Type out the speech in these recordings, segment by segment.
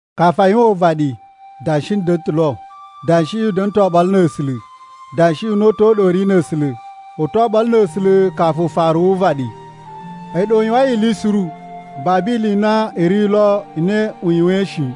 Kafu a yuwan uvaɗi Danshi da̱na̱ ta̱ lo. Danshiꞌi u da̱na̱ ta̱ oɓolo na̱ A̱sula̱, Danshiꞌi una̱ta̱ u ɗa u ri na̱ A̱sula̱. U to oɓolo na̱ A̱sula̱ kafu ufaru wu uvaɗi. A̱yi ɗa u yuwain ili suru. Babu ili i na i ri lo i na u yuwain shi.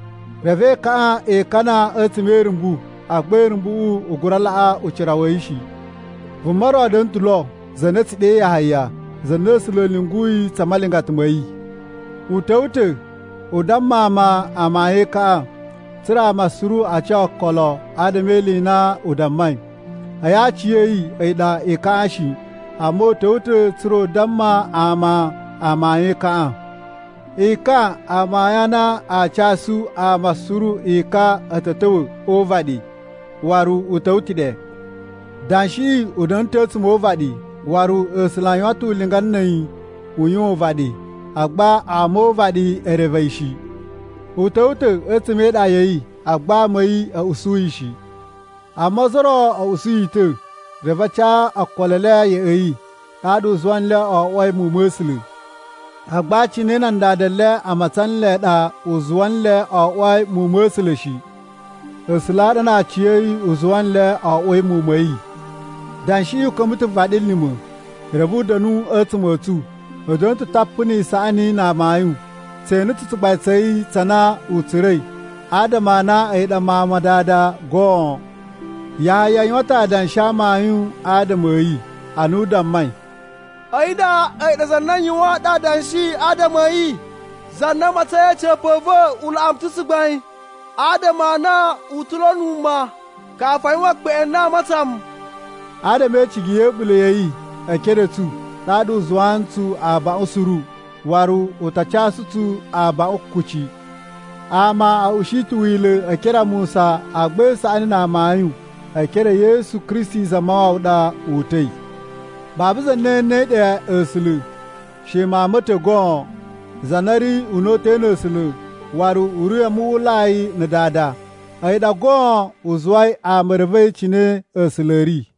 Reve ekaꞌan e ikana a̱tsuma̱ e irumbu, agba irumbuꞌu i gura laꞌa yi ucira shi. Vuma ro da̱na̱ ta̱ lo za na a̱ tsu ɗe Yahaya, za na A̱sula̱ a̱ lyunguyi tsa malingata ma̱ yi. U ta̱wa̱ ta̱ u damma ama amayun e ekaꞌan, tsa̱ra̱ ama suru a ca okolo adama e ili i na u dammai. A̱yi aciya̱yi a̱yi ɗa ekaꞌan shi, amma u ta̱wa̱ ta̱ tsa̱ra̱ u damma ama amayun e ekaꞌan. Ekan a amayun a na a casu ama suru ekan a̱ ta̱ ta̱wa̱ o uvaɗi, waru u ta̱wa̱ ta̱ ɗe! Danshiꞌi u da̱na̱ ta̱ a̱tsuma̱ o uvaɗi waru A̱sula̱ a yuwan ta̱ ulinga na̱ a̱yi u yuwan uvaɗi, agba ama o uvaɗi e reve yi shi. U ta̱wa̱ ta̱ a̱tsuma̱ e iɗa ya̱ yi agba ama a̱ yi a̱ usu yi shi. Amma ozo o ro a̱ usu yi ta̱, reve a ca okolo e le ya̱ꞌa̱ yi. Ɗaɗa u zuwa nle o oꞌwoi muwun ma̱ A̱sula̱. Agba cine na nan dada le a matsan nle ɗa u zuwa nle o oꞌwoi muwun ma̱ A̱sula̱ shi. A̱sula̱ a ɗa na aciya̱yi u zuwa nle o oꞌwoi muwun ma̱ yi. Danshiꞌi u ka̱mba̱ ta̱ vaɗilima̱, reve u da̱nu a̱tsuma̱ a̱ tsu. U da̱na̱ ta̱ tapu ni isaꞌani na amayun. Tse ene ta̱ tsugbain tsa̱ yi tsa na u tsura̱i adama a na a̱yi ɗa Mawun ma Dada goon. Yahaya yuwan ta̱ adanshi a amayun adama a̱ yi ana u dammai, “A̱yi nda a̱yi ɗa Za na n yuwaan nɗu adanshi adama a̱ yi: ‘Za na a matsain a̱ca̱pa̱ a̱ va̱ u laꞌa mu ta̱ tsugbain adama a na u ta̱ lo wuma, kafu a yuwan ekpeꞌwin a na a matsan mu.’” Adama e icigi ya̱ a̱ɓula̱ ya̱ yi e ekere a̱ tsu, ɗaɗa u zuwaa ntsu abaꞌun suru, waru u ta casu tsu abaꞌun kuci. Ama a̱ ushi ta̱ Wila̱ e ekere a Musa, agba isaꞌani na amayun e ekere e Yesu Kristi Zamawawa ɗa o uta̱i. Babu za na enei ɗe A̱sula̱, she Mawun ma̱ ta̱ goon, za na ri una̱ta̱ na̱ A̱sula̱ waru u ri a muwwulai na̱ Dada. A̱yi ɗa goon u zuwai ama e revei cine A̱sula̱ a̱ ri.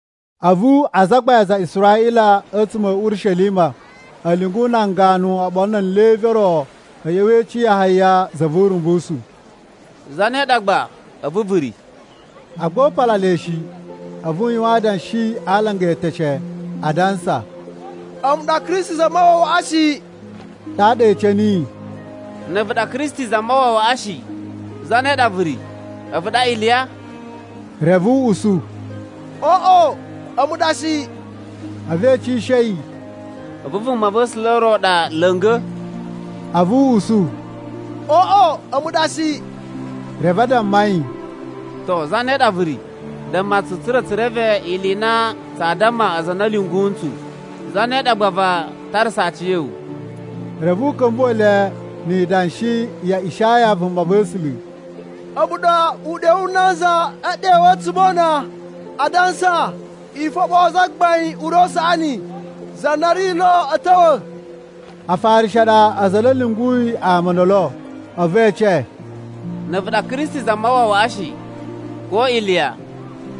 A̱vu azagbain a aza a Israꞌila a̱tsuma̱ a̱ Urishelima a̱ lyungu nan ganu oɓolo na̱ nan Levi o ro a̱ ꞌya̱wa̱ e ece Yahaya za vu Urumbusu, “Zane ɗa gba a̱vu vu ri?” Agba u pala le shi, a̱vu u yuwan adanshi a alanga e eteshe, adansa, “A̱mu ɗa Kristi Zamawawaꞌa shi.” Ɗaɗa e ece niyi, “Na̱ a̱vu ɗa Kristi Zamawawaꞌa shi, zane ɗa vu ri? A̱vu ɗa Iliya?” Reve u usu, “Oꞌo, a̱mu ɗa shi.” A̱vu e ecishe yi, “A̱vu Vumava̱sula̱ ro ɗa la̱nga̱?” A̱vu u usu, “Oꞌo, a̱mu ɗa shi.” Reve a damma yi, “To zane ɗa vu ri? Damma tsu tsa̱ra̱ tsu reve ili i na tsaa damma aza a na a̱ lyungu ntsu. Zane ɗa gba vaa tarasa aciya̱wu?” Reve u ka̱mbuwa̱ le ni idanshi ya Ishaya vumava̱sula̱: “A̱mu ɗa uɗyo wu nanza e ɗewu a̱tsuma̱ o una, adansa, ‘I foɓoo Zagbain ure u saꞌani, za na ri lo a̱ ta̱wa̱.’” Afarishi a ɗa aza a na a̱ lyunguyi ama o ndolo. A̱vu e ece, “Na̱ a̱vu ɗa Kristi Zamawawaꞌa shi, ko Iliya,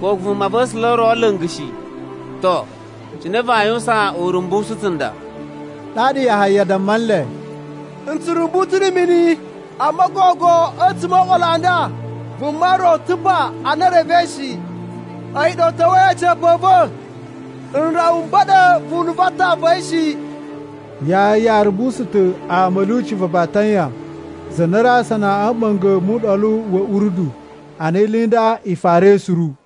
ko Vumava̱sula̱ ro la̱nga̱ shi, to, cine vaa yuwusan urumbusu tsunda?” Ɗaɗa Yahaya damma nle, “N tsu rumbu ta̱ na̱ mini, amma gogo a̱tsuma̱ o oɓolo a nda, vuma ro ta̱ pa a na i revei shi. A̱yi ɗa u ta̱wa̱i a̱ca̱pa̱ a̱ va̱. N rawa m ba̱ɗa̱ vunu va atan va̱ yi shi.” Yahaya rumbusu ta̱ ama a̱ lyuci va Batanya za na ri asana a̱ mɓa̱nga̱ mu Uɗolu wa̱ Urdu ana ili i nda i farai suru.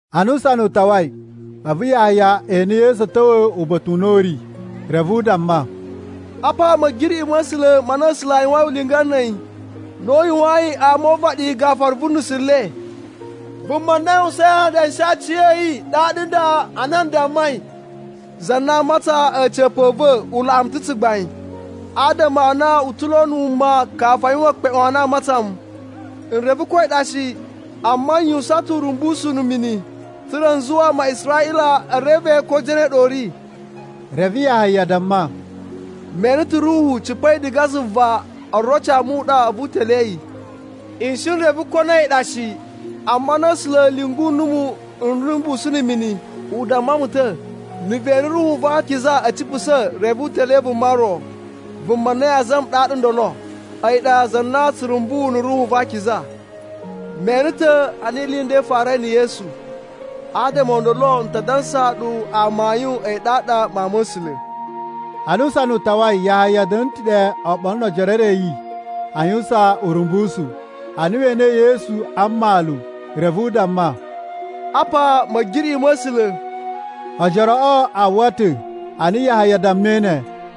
Ana usana u tawai, a̱vu Yahaya ene Yesu a̱ ta̱wa̱ uba̱ta̱ u na u ri. Reve u damma, “Apa Ma̱giriꞌi ma̱ A̱sula̱ ma na A̱sula̱ a yuwain ulinga na̱ a̱yi na u yuwayin ama o uvaɗi gafura vu nusu le. Vuma na n yuwusain adanshi a aci a̱ yi a ɗaɗa nda ana n dammai, ‘Za na a matsain a̱ca̱pa̱ a̱ va̱ u laꞌa mu ta̱ tsugbain, adama a na u ta̱ lo wuma kafu a yuwan ekpeꞌwin a na a matsan mu.’ N reve ko a̱yi ɗa shi, amma n yuwusan ta̱ urumbusu na̱ mini, tsa̱ra̱ n zuwa ama a Israꞌila e reve ko zane ɗa u ri.” Reve Yahaya damma, “Me ene ta̱ Ruhu cipa̱i diga zuva oroci a muɗa a̱vu u telee yi. N shi n reve ko na a̱yi ɗa shi, amma ana A̱sula̱ a̱ lyungu numu n rumbusu na̱ mini, u damma mu ta̱, ‘Na̱ ve ene Ruhu va Akiza a̱ cipusa̱ reve u telee vuma ro, vuma na yaa zama ɗaɗa ndolo. A̱yi ɗa za na tsu rumbu na̱ Ruhu va Akiza.’ Me ene ta̱ ana ili i nda i farai na̱ Yesu. Adama o ndolo n ta dansaa ɗu amayun a na a̱yi ɗaɗa Mawun ma̱ A̱sula̱.” Ana usana u tawai, Yahaya da̱na̱ ta̱ ɗe oɓolo no ojoro e re a̱ yi a yuwusan urumbusu. Ana we enei Yesu a mmalu, reve u damma, “Apa Ma̱giriꞌi ma̱ A̱sula̱!” Ojoroꞌo a uwwa ta̱ ana Yahaya dammai ne,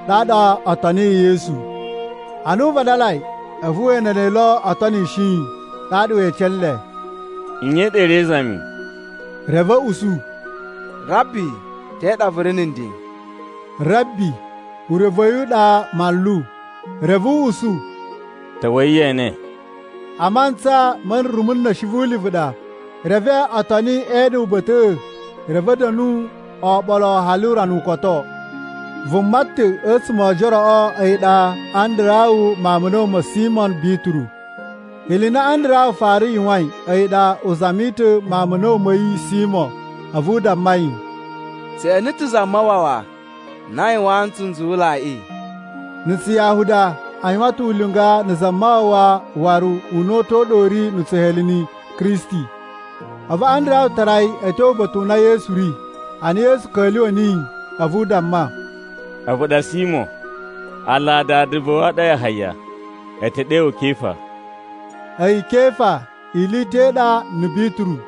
ɗaɗa o toniyi Yesu. Ana u vadalai a̱vu we ene le o tonishi yi, ɗaɗa we ece nle, “Nye ɗa i ri e izami?” Reve a̱ usu, “Rabbi, te ɗa vu ri na̱ nden?” (“Rabbi” urevu wa̱ yi a̱yi ɗa “Manlu.”) Reve u usu, “Ta̱wa̱i ye ene.” (A mantsa ma̱ rumu na̱shi vu ulivu ɗa.) Reve o toni e ene uba̱ta̱ꞌa̱, reve a̱ da̱nu oɓolo hali urana u koto. Vuma ta̱ a̱tsuma̱ o ojoroꞌo a̱yi ɗa Andarawu mawun ma̱ a̱na̱wu ma̱ Simo Bituru. Ili i na Andarawu fara yuwain a̱yi ɗa u zami ta̱ mawun ma̱ a̱na̱wu ma̱ yi Simo, a̱vu u damma yi, “Tse ene ta̱ Zamawawa na a yuwaan ntsu nzuwulaiꞌi!” (Na̱ Tsuyahuda a yuwan ta̱ ulinga na̱ “Zamawawa” waru una̱ta̱ u ɗa u ri na̱ Tsuheleni “Kristi.”) A̱vu Andarawu tara yi a̱ tyo uba̱ta̱ u na Yesu ri. Ana Yesu ka̱lyuwa̱ niyi a̱vu u damma, “A̱vu ɗa Simo, aala a dada va̱ wu a ɗa Yahaya. A̱ ta̱ ɗe wu Kefa.” (A̱yi “Kefa” ili i ta̱ i ɗa na̱ “Bituru.”)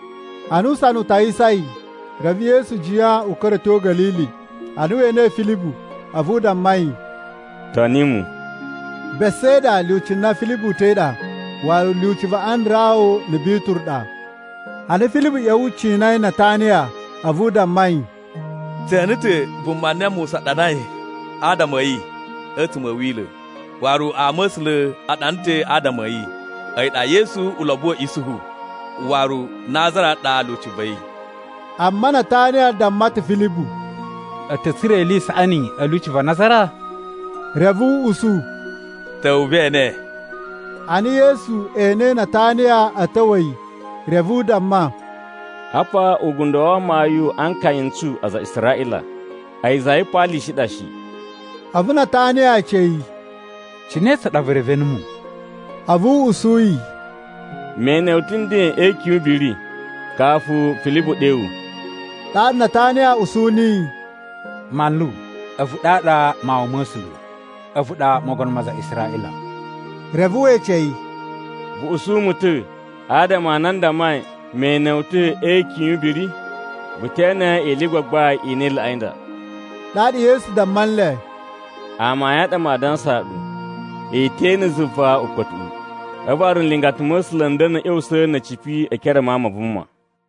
Ana usana u tawisai, reve Yesu jiyan u ka̱ra̱ a̱ tyo Ga̱lili. Ana we enei Filibu, a̱vu u damma yi, “Toni mu.” Besaida lyuci na Filibu uta̱i ɗa, waru lyuci va Andarawu na̱ Bituru ɗa. Ana Filibu ꞌya̱wa̱ cinai Nataniya a̱vu u damma yi, “Tse ene ta̱ vuma na Musa ɗanai adama a̱ yi a̱tsuma̱ a̱ Wila̱. Waru ama̱sula̱ a ɗana ta̱ adama a̱ yi. A̱yi ɗa Yesu ulobo wa̱ Isuhu, waru Nazara ɗa lyuci va̱ yi.” Amma Nataniya damma ta̱ Filibu, “A̱ ta̱ tsura̱ ili i saꞌani a̱ lyuci va Nazara?” Reve u usu, “Ta̱wa̱ ve ene.” Ana Yesu enei Nataniya a̱ ta̱wa̱ yi, reve u damma, “Apa ugundo wa amayun a nkaya n tsu aza a Israꞌila. A̱yi za yipaalishi i ɗa shi.” A̱vu Nataniya ece yi, “Cine tsa ɗa vu reve numu?” A̱vu u usu yi, “Me ene wu ta̱ nden e ikyun yu ubiri, kafu Filibu ɗe wu.” Ɗaɗa Nataniya usu niyi, “Manlu, a̱vu ɗaɗa Mawun ma̱ A̱sula̱. A̱vu ɗa Mogono ma aza a Israꞌila.” Reve we ece yi, “Vu usu mu ta̱ adama a na n dammai me ene wu ta̱ e ikyun yu ubiri? Vu te ene ili i gbagbain i na i laꞌai nda.” Ɗaɗa Yesu damma nle, “Amayun a ɗa maa dansaa ɗu, i te ene zuva ukpa̱tuꞌu, a̱vu waru nlingata ma̱ A̱sula̱ n da̱na̱ a̱ ꞌya̱wusa̱ na̱ a̱ cipi e ekere a Mawun ma Vuma.”